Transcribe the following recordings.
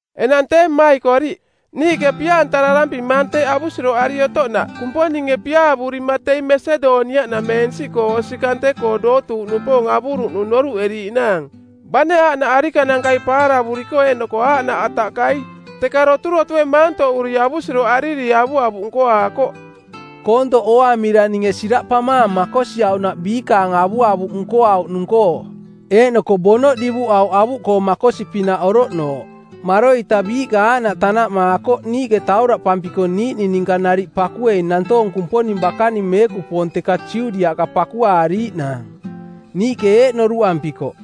Enang tee mmaikoriꞌ, niiꞌke pia-antararampimaang teeꞌ avusiroꞌari otoꞌnaꞌ Kumponinge piaavurima teing Masedoniaꞌnameensiꞌkoo osi kante-koo dootuuꞌnupoong avuruꞌnung noruꞌeriiꞌnaang. Bane aaꞌnaꞌ arikanankai paaravuriko eeꞌnoko aaꞌnaꞌ ataꞌkai, teka doturotue maantoꞌuri avusiroꞌariri avuavuꞌ nkoaakoꞌ. Koontoꞌ ooamira ninge siraꞌpamaang makosiauꞌnaꞌ biikaang avuavuꞌ nkoauꞌnung-koo, eeꞌnoko bonoꞌ divuꞌauꞌ avuꞌkoo makosi-pinaꞌ oroꞌnooꞌ. Maroita biiꞌka aaꞌnaꞌ tanaꞌmaakoꞌ niiꞌke tauraꞌparampiko niiꞌning ninka nariꞌ pakuei nantoong Kumponing bakaning meekupoong teka Judiaꞌka pakuaariiꞌnaang. Niiꞌke eeꞌ noruꞌampikoꞌ,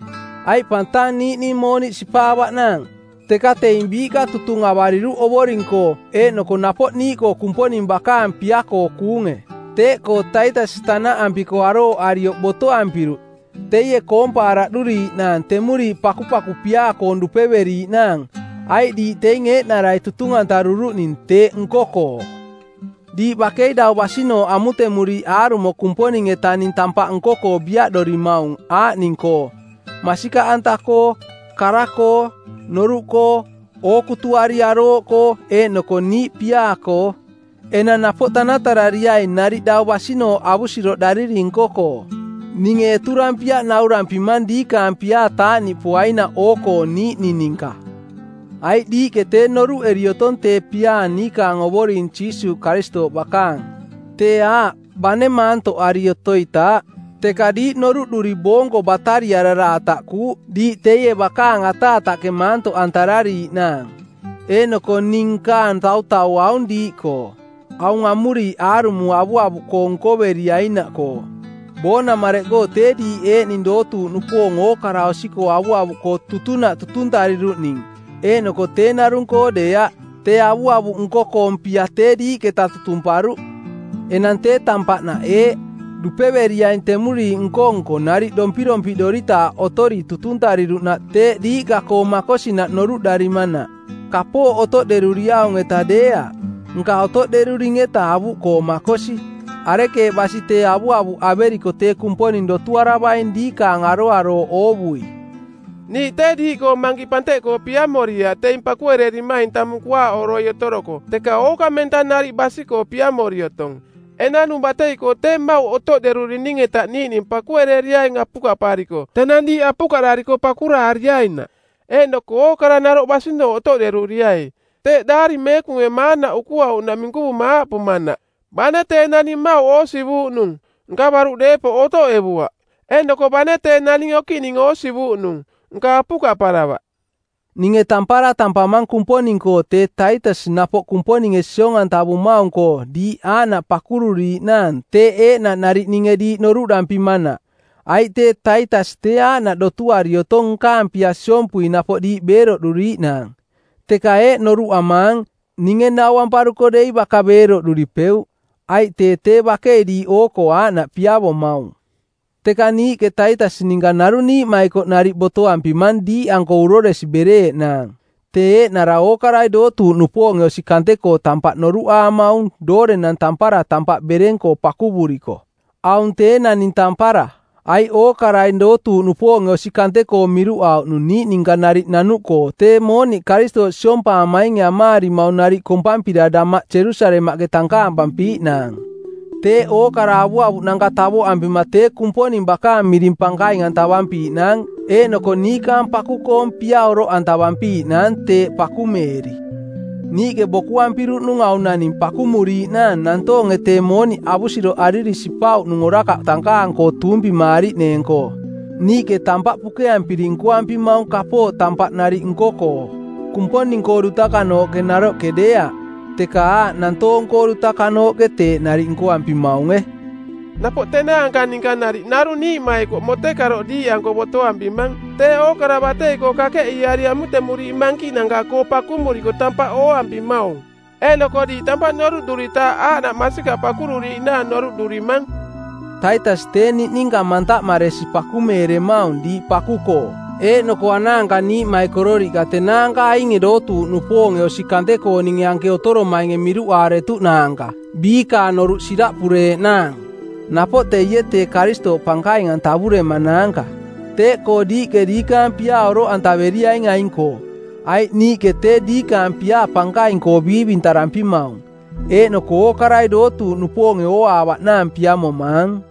“Aiꞌ pang tang niiꞌning mooniꞌ sipaavaꞌnaang,” teka teing biiꞌka tutung avariruꞌ Ovoring-koo eeꞌnoko napoꞌ niiꞌkoo Kumponing bakaang pia-koo kuunge. Teeꞌkoo Taitas tanaꞌampiko arooꞌarioꞌ botoampiruꞌ teie koompaaraꞌduriiꞌnaang temuriiꞌ pakupaku piaa-koong dupeveriiꞌnaang, aiꞌ diiꞌ teing eeꞌnarai tutung-antaruruꞌning teeꞌ nko-koo. Diiꞌ bakei dau basinooꞌ amutemuriiꞌ aarumo Kumponing-etaning tampaꞌ nko-koo biaꞌdorimaung aaꞌning-koo: masikaꞌanta-koo, kara-koo, noruꞌkoo, ookutuari arooꞌkoo eeꞌnoko niiꞌ piaa-koo. Enang napoꞌ tanatarariai nariꞌ dau basinooꞌ avusiroꞌdariri nko-koo. Ninge eturampiaꞌ naurampimang diikaang piaa taaꞌniꞌpoainaꞌ oo-koo niiꞌning ninka. Aiꞌ diiꞌke tee noruꞌeri otong tee piaa niikaang Ovoring Jiisuuꞌ Karistooꞌ bakaang. Tee aaꞌ bane maantoꞌari otoitaaꞌ, teka diiꞌ noruꞌduri boonko batariꞌarara ataꞌkuuꞌ diiꞌ teie bakaang ataataꞌke maantoꞌantarariiꞌnaang. Eeꞌnoko ning nkaang tautau aung diiꞌkoo, aung amuriiꞌ aarumo avuavuꞌkoong nkoveriainaꞌkoo: Boonamareꞌkoo tee diiꞌ eeꞌning dootuuꞌnupoong ookara osi-koo avuavuꞌkoo tutunaꞌ tutuntariruꞌning, eeꞌnoko tee narung-koo deeaꞌ, tee avuavuꞌ nko-koong pia tee diiꞌketa tutumparuꞌ. Enang tee tampaꞌnaꞌ eeꞌ: dupeveriaing temuriiꞌ nko-nko nariꞌ dompirompiꞌdoritaaꞌ otori tutuntariruꞌnaꞌ teeꞌ diiꞌka-koo makosinaꞌ noruꞌdarimanaꞌ. Kapooꞌ otoꞌderuriaung-eta deeaꞌ, nka otoꞌderurining-eta avuꞌkoo makosi. Arekeeꞌ basi tee avuavuꞌ averiko tee Kumponing dotuaravaing diikaang aroarooꞌ oovui. Niiꞌ tee diiꞌkoo mankiꞌ panteꞌkoo piamoriaꞌ teing pakuererimaing tamung kuaaꞌoroi otoroko, teka ookamenta nariꞌ basi-koo piamori otong. Enanung batei-koo tee mmauꞌ otoꞌderurining-eta niiꞌning pakuereriaing apukaꞌpariko tenang diiꞌ apukaꞌdariko pakuraariainaꞌ. Eeꞌnoko ookara naroꞌ basinooꞌ otoꞌderuriai. Teeꞌ Daari Meekunge maanaꞌ ukuauꞌnaꞌ minkuvuma aaꞌpumanaꞌ, “Bane tee naning mmauꞌ oosivuuꞌnung, nka baruꞌ deepoꞌ otoꞌevuaꞌ, eeꞌnoko bane tee naning okiꞌning oosivuuꞌnung nka apukaꞌparavaꞌ.” Ninge tampara tampamang Kumponing-koo tee Taitas napoꞌ Kumponinge siong-antavumaung-koo diiꞌ aaꞌnaꞌ pakururiiꞌnaang teeꞌ eeꞌnaꞌ nariꞌ ninge diiꞌ noruꞌdampimanaꞌ. Aiꞌ tee Taitas tee aaꞌnaꞌ dotuari otong nkaang pia siompui napoꞌ diiꞌ beeroꞌduriiꞌnaang, teka eeꞌ noruꞌamaang, ninge nauamparuko dei baka beeroꞌduripeuꞌ, aiꞌ tee tee bakei diiꞌ oo-koo aaꞌnaꞌ piavomaung. Teka niiꞌke Taitas ninka narung niiꞌmaikoꞌ nariꞌ botoampimang diiꞌanko uroresi bereeꞌnaang, tee eeꞌnara ookarai dootuuꞌnupoonge osi kante-koo tampaꞌ noruꞌaamaung doorenang tampara tampaꞌ bereng-koo pakuvuriko. Aung tee naning tampara, aiꞌ ookarai dootuuꞌnupoonge osi kante-koo miruꞌauꞌnung niiꞌ ninka nariꞌ nanuꞌkoo tee mooniꞌ Karistooꞌ siompaamainge amaarimaung nariꞌ kompampira damaꞌ Jerusalemaꞌke tankaampampiiꞌnaang. Teeꞌ ookara avuavuꞌnanka tavoꞌampima tee Kumponing bakaang miring pankaing-antavampiiꞌnaang eeꞌnoko niikaang paku-koong pia oroꞌantavampiiꞌnaang teeꞌ pakumeeri. Niiꞌke bokuampiruꞌnung aung naning pakumuriiꞌnaang nantoonge tee mooniꞌ avusiroꞌariri sipauꞌnung orakaꞌ tankaang-koo tuumpimaariꞌneeng-koo. Niiꞌke tampaꞌ pukeampiri nkoampimaung kapooꞌ tampaꞌ nariꞌ nko-koo, Kumponing-koo dutakanooꞌke naroꞌke deeaꞌ, teka aaꞌ nantoong-koo dutakanooꞌke teeꞌ nariꞌ nkoampimaunge. Napoꞌ tenaanka ninka nariꞌ narung niiꞌmaikoꞌ motekaroꞌ diiꞌanko botoampimang tee ookara batei-koo kakeꞌiiari amutemuriiꞌ mankiꞌnanka-koo pakumuriko tampaꞌ ooampimaung, eeꞌnoko diiꞌ tampaꞌ noruꞌduritaaꞌ aaꞌnaꞌ masikaꞌ pakururiiꞌnaang noruꞌdurimang. Taitas tee niꞌninka mantaꞌmaresi pakumeeremaung diiꞌ paku-koo eeꞌnoko anaanka niiꞌmaikororiꞌka tenaanka ainge dootuuꞌnupoonge osi kante-kooninge anke otoromainge miruꞌaaretuꞌnaanka biikaang noruꞌ siraꞌpureeꞌnaang. Napoꞌ teie tee Karistooꞌ pankaing-antavuremanaanka. Teeꞌkoo diiꞌke diikaang piaa oroꞌantaveriaing aing-koo, aiꞌ niiꞌke tee diikaang piaa pankaing-koo biivintarampimaung, eeꞌnoko ookarai dootuuꞌnupoonge ooaavaꞌnaang piamomaang.